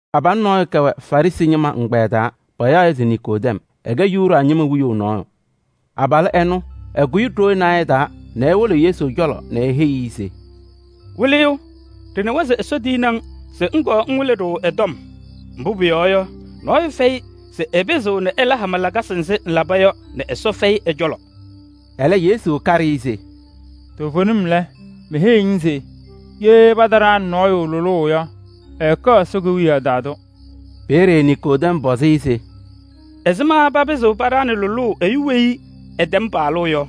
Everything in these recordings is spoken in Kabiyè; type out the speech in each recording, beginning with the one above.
Abalʋ nɔɔyʋ kɛwɛ Farɩsɩ ñɩma ɛgbɛyɛ taa, payaɣ-ɩ se Niikodɛm. Ɛkɛ Yuda ñɩma wiyaʋ nɔɔyʋ. Abalʋ ɛnʋ, ɛkʋyɩ ɖoo naayɛ taa nɛ ewolo Yesu cɔlɔ nɛ eheyi-i se: “Wɩlɩyʋ! Ɖɩnawa se Ɛsɔ tiyini-ŋ se ŋkɔɔ ŋwɩlɩ-ɖʋ ɛ-tɔm. Mbʋ pʋyɔɔ yɔ, nɔɔyʋ fɛyɩ se ɛpɩzɩɣ ɛla hama lakasɩ nzɩ ŋlaba yɔ nɛ Ɛsɔ fɛyɩ ɛ-cɔlɔ.” Ɛlɛ Yesu kaɖɩ-ɩ se: “Toovenim lɛ, meheyiɣ-ŋ se ye pataɖaɣnɩ nɔɔyʋ lʋlʋʋ yɔ, ɛɛkɛɣ Ɛsɔ Kewiyaɣ taa tʋ.” Peeye Niikodɛm pɔzɩ-ɩ se: “Ɛzɩma papɩzɩɣ paɖaɣnɩ lʋlʋʋ ɛyʋ weyi ɛtɛm paɣlʋʋ yɔ?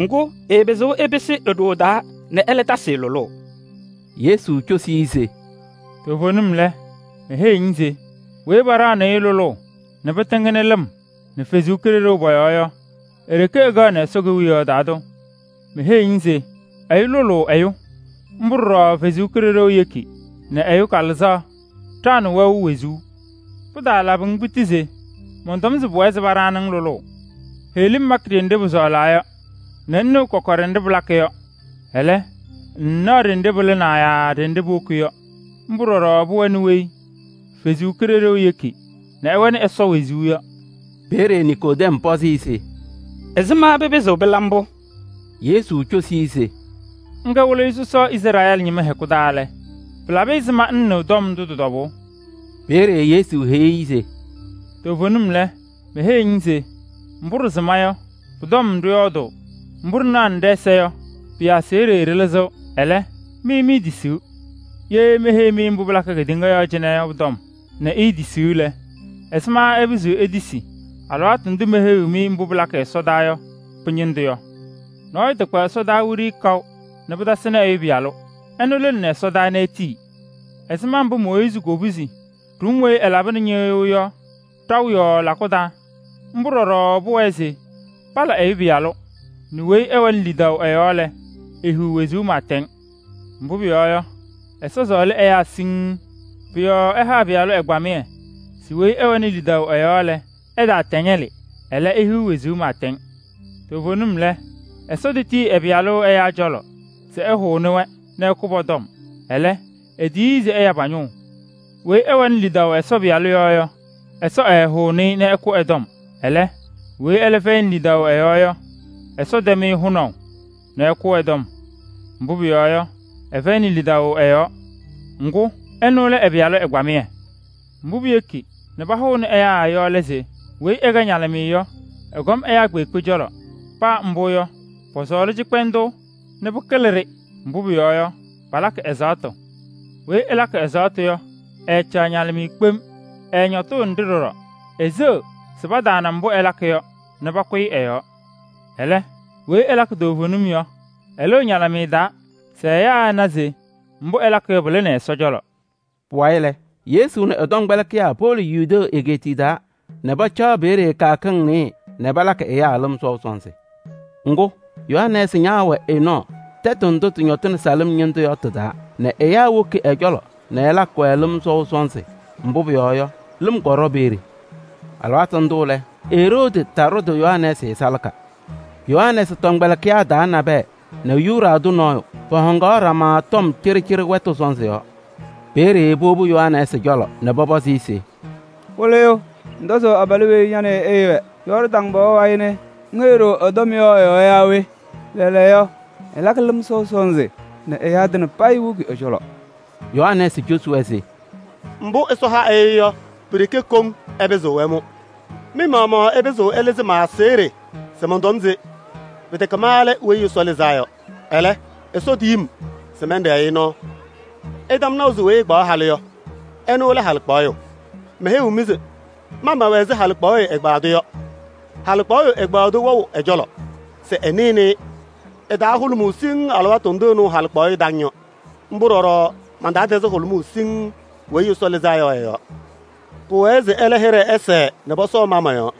Ŋgʋ, ɛɛpɩzɩɣ ɛpɩsɩ e-ɖoo taa nɛ ɛlɛ tasɩ-ɩ lʋlʋʋ!” Yesu cosi-i se: “Toovenim lɛ, meheyiɣ-ŋ se weyi paɖaɣnɩɣ-ɩ lʋlʋʋ nɛ pɩtɩŋnɩ lɩm nɛ Ɛsɔ Kalɩzaɣ pɔ-yɔɔ yɔ, e-ɖeke ɛkɛɣnɩ Ɛsɔ Kewiyaɣ taa tʋ. Meheyiɣ-ŋ se: ɛyʋ lʋlʋʋ ɛyʋ. Mbʋ ɖɔɖɔ Ɛsɔ Kalɩzaɣ yeki nɛ ɛyʋ kalɩzaɣ ɖaɣnɩ wɛʋ wezuu. Pɩtaalabɩ-ŋ piti se mɔntɔm se pʋwɛɛ se paɖaɣnɩ-ŋ lʋlʋʋ. Heɣlim makɩ ɖenɖe pʋsɔɔlaa yɔ nɛ ŋnɩɣ kɔkɔɖɛ nɖɩ pɩlakɩ yɔ. Ɛlɛ, ŋŋnaɣ ɖenɖe pɩlɩnaa yaa ɖenɖe puwoki yɔ. Mbʋ ɖɔɖɔ pʋwɛnɩ weyi Ɛsɔ Kalɩzaɣ yeki nɛ ɛwɛnɩ Ɛsɔ wezuu yɔ.” Peeye Niikodɛm pɔzɩ-ɩ se: “Ɛzɩma pɩpɩzɩɣ pɩla mbʋ?” Yesu cosi-i se: “Ŋkɛ Wɩlɩyʋ sɔsɔ Izrɛɛlɩ ñɩma hɛkʋ taa lɛ, pɩla ɛzɩma ŋŋnɩɣ tɔm ndʋ tɩ-tɔbʋʋ yɔ?” Peeye Yesu heyi-i se: “Toovenim lɛ, meheyiɣ-ŋ se mbʋ ɖɩsɩma yɔ, pʋ-tɔm ɖɩyɔɔdʋʋ, mbʋ ɖɩnanɩ ɖɛ-ɛza yɔ, pɩ-aseɣɖe ɖɩlɩzɩɣ. Ɛlɛ, mɩ miitisiɣ. Ye meheyiɣ-mɩ mbʋ pɩlakɩ kedeŋa yɔɔ cɩnɛ yɔ pʋ-tɔm nɛ iitisiɣ lɛ, ɛzɩma ɩpɩzɩɣ itisi alɩwaatʋ ndʋ meheyiɣ-mɩ mbʋ pɩlakɩ ɛsɔdaa yɔ pɩ-ñɩndʋ yɔ? Nɔɔyʋ takpa ɛsɔdaa wiɖiyi kaʋ nɛ pɩtasɩnɩ Ɛyʋ Pɩyalʋ, ɛnʋ lɩnɩnɩ ɛsɔdaa nɛ etii. Ɛzɩma mbʋ Mooyiizi kopuzi ɖʋm weyi ɛlabɩnɩ ñɩɣyʋʋ yɔ ɖaʋ yɔɔ lakʋ taa, mbʋ ɖɔɖɔ pʋwɛɛ se pala Ɛyʋ Pɩyalʋ, nɛ weyi ɛwɛnɩ lidaʋ ɛ-yɔɔ lɛ, ehiɣ wezuu pɩɩtɛŋ. Mbʋ pʋyɔɔ yɔ, Ɛsɔ sɔɔlɩ ɛyaa siŋŋ. Pʋ-yɔɔ ɛha ɛ-Pɩyalʋ ɛgbamɩyɛ se weyi ɛwɛnɩ lidaʋ ɛ-yɔɔ lɛ, ɛtaatɛŋɛlɩ, ɛlɛ, ehiɣ wezuu pɩɩtɛŋ. Toovenim lɛ, Ɛsɔ tetiyi ɛ-Pɩyalʋ ɛyaa cɔlɔ se ɛhʋnɩ-wɛ nɛ ɛkʋ pɔ-tɔm. Ɛlɛ, etiyi-i se ɛya pa-ñʋʋ. Weyi ɛwɛnɩ lidaʋ Ɛsɔ Pɩyalʋ yɔɔ yɔ, Ɛsɔ ɛɛhʋʋnɩ-ɩ nɛ ɛkʋ ɛ-tɔm. Ɛlɛ, weyi ɛlɛ fɛyɩnɩ lidaʋ ɛ-yɔɔ yɔ, Ɛsɔ tɛm-ɩ hʋnaʋ nɛ ɛkʋ ɛ-tɔm. Mbʋ pʋyɔɔ yɔ, ɛfɛyɩnɩ lidaʋ ɛ-yɔɔ, ŋgʋ ɛnʋ lɛ ɛ-Pɩyalʋ ɛgbamɩyɛ. Mbʋ piyeki nɛ pahʋʋnɩ ɛyaa yɔ lɛ se: weyi ɛkɛ ñalɩmɩyɛ yɔ, ɛkɔm ɛyaa kpeekpe cɔlɔ. Paa mbʋ yɔ, pɔsɔɔlɩ cɩkpɛndʋʋ nɛ pɩkɩlɩ-ɖɩ, mbʋ pʋyɔɔ yɔ, palakɩ ɛzaɣtʋ. Weyi ɛlakɩ ɛzaɣtʋ yɔ, ɛɛcaɣ ñalɩmɩyɛ kpem, ɛɛñɔtʋʋnɩ-ɖɩ ɖɔɖɔ: eseɣ se pataana mbʋ ɛlakɩ yɔ nɛ pakʋyɩ ɛ-yɔɔ. Ɛlɛ, weyi ɛlakɩ toovenim yɔ, ɛlɩɣ ñalɩmɩyɛ taa se ɛyaa ɛna se mbʋ ɛlakɩ yɔ, pɩlɩnɩ Ɛsɔ cɔlɔ.” Pʋwayɩ lɛ, Yesu nɛ ɛ-tɔmkpɛlɩkɩyaa powolo Yudee egeetiye taa nɛ pacaɣ peeye kɩyakɩŋ nɩɩyɩ nɛ palakɩ ɛyaa lɩm sɔʋ sɔnzɩ. Ŋgʋ, Yohanɛɛsɩ ñaawɛ Enɔɔ tɛtʋ ndʋ tɩñɔtɩnɩ Salɩm ñɩndʋ yɔ tɩ-taa nɛ ɛyaa woki ɛ-cɔlɔ nɛ ɛlakɩ-wɛ lɩm sɔʋ sɔnzɩ. Mbʋ pʋyɔɔ yɔ, lɩm kɔɖɔ peeye. (Alɩwaatʋ ndʋ lɛ, Eroodi taɖʋdɩ Yohanɛɛsɩ salaka.) Yohanɛɛsɩ tɔmkpɛlɩkɩyaa taa nabɛyɛ nɛ Yuda tʋ nɔɔyʋ, pɔhɔŋaɣnɩ ɖama tɔm cɩɖɩcɩɖɩ wɛtʋ sɔnzɩ yɔɔ. Peeye powobi Yohanɛɛsɩ cɔlɔ nɛ pɔpɔzɩ-ɩ se: “Wɩlɩyʋ! Ŋtɔzʋʋ abalʋ weyi ña nɛ ɩ ɩɩwɛ Yɔɔrdaŋ pɔɔ wayɩ nɛ ŋheyi-ɖʋ ɛ-tɔm yɔ ɛ-yɔɔ yaa we? Lɛɛlɛɛyɔ, ɛlakɩ lɩm sɔʋ sɔnzɩ nɛ ɛyaa tɩŋa woki ɛ-cɔlɔ!” Yohanɛɛsɩ cosi-wɛ se: “Mbʋ Ɛsɔ ha ɛyʋ yɔ, pi-ɖeke koŋ ɛpɩzɩɣ ɛmʋ. Mɩ-maɣmaɣ ɩpɩzɩɣ ɩlɩzɩ ma-aseɣɖe se mɔntɔm se: ‘Pɩtɛkɛ ma lɛ Weyi Ɛsɔ Lɩzaa Yɔ. Ɛlɛ, Ɛsɔ tiyi-m se mɛnɖɛɛ-ɩ nɔɔ.’ Ɩtɛm naʋ se weyi ɛkpaɣ halʋ yɔ, ɛnʋ lɛ halɩkpaɣyʋ. Meheyiɣ-mɩ se ma mɛwɛ ɛzɩ halɩkpaɣyʋ ɛgbaadʋ yɔ. Halɩkpaɣyʋ ɛgbaadʋ wɛɣ ɛ-cɔlɔ se ɛsɩnɩ-ɩ. Ɛ-taa hʋlʋmʋʋ siŋŋ alɩwaatʋ ndʋ ɛnɩɣ halɩkpaɣyʋ taŋ yɔ. Mbʋ ɖɔɖɔ man-taa tɛzɩ hʋlʋmʋʋ siŋŋ Weyi Ɛsɔ Lɩzaa Yɔ ɛ-yɔɔ. Pʋwɛɛ se ɛlɛ hɩɖɛ ɛsɛɛ nɛ pɔsɔɔ ma mɔ-yɔɔ.”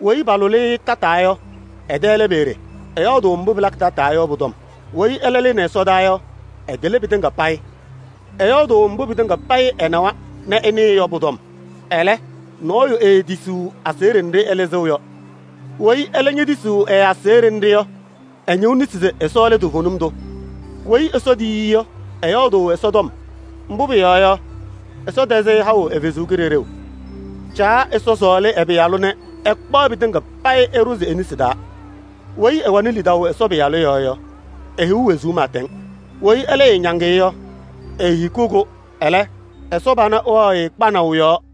“Weyi palʋlɩ-ɩ tataa yɔ, ɛ-tɛ lɛ peeye, ɛyɔɔdʋʋ mbʋ pɩlakɩ tataa yɔ pʋ-tɔm. Weyi ɛlɛ lɩnɩ ɛsɔdaa yɔ, ɛkɩlɩ pɩtɩŋa payɩ. Ɛyɔɔdʋʋ mbʋ pɩtɩŋa payɩ ɛnawa nɛ ɛnɩɩ yɔ pʋ-tɔm. Ɛlɛ, nɔɔyʋ eetisiɣ aseɣɖe nɖɩ ɛlɩzɩɣ yɔ. Weyi ɛlɛ ñetisiɣ ɛ-aseɣɖe nɖɩ yɔ, ɛñɩɣ nesi se Ɛsɔ lɛ toovenim tʋ. Weyi Ɛsɔ tiyi-i yɔ, ɛyɔɔdʋʋ Ɛsɔ tɔm. Mbʋ pʋyɔɔ yɔ, Ɛsɔ tɛzɩ-ɩ haʋ ɛ-Kalɩzaɣ. Caa Ɛsɔ sɔɔlɩ ɛ-Pɩyalʋ nɛ ɛkpaɣ pɩtɩŋa payɩ ɛɖʋzɩ e-nesi taa. Weyi ɛwɛnɩ lidaʋ Ɛsɔ Pɩyalʋ yɔɔ yɔ, ehiɣ wezuu pɩɩtɛŋ. Weyi ɛlɛ ɛɛñaŋ-ɩ yɔ, eehikiɣ-kʋ. Ɛlɛ, Ɛsɔ pana wɛɣ-ɩ kpanaʋ yɔɔ.”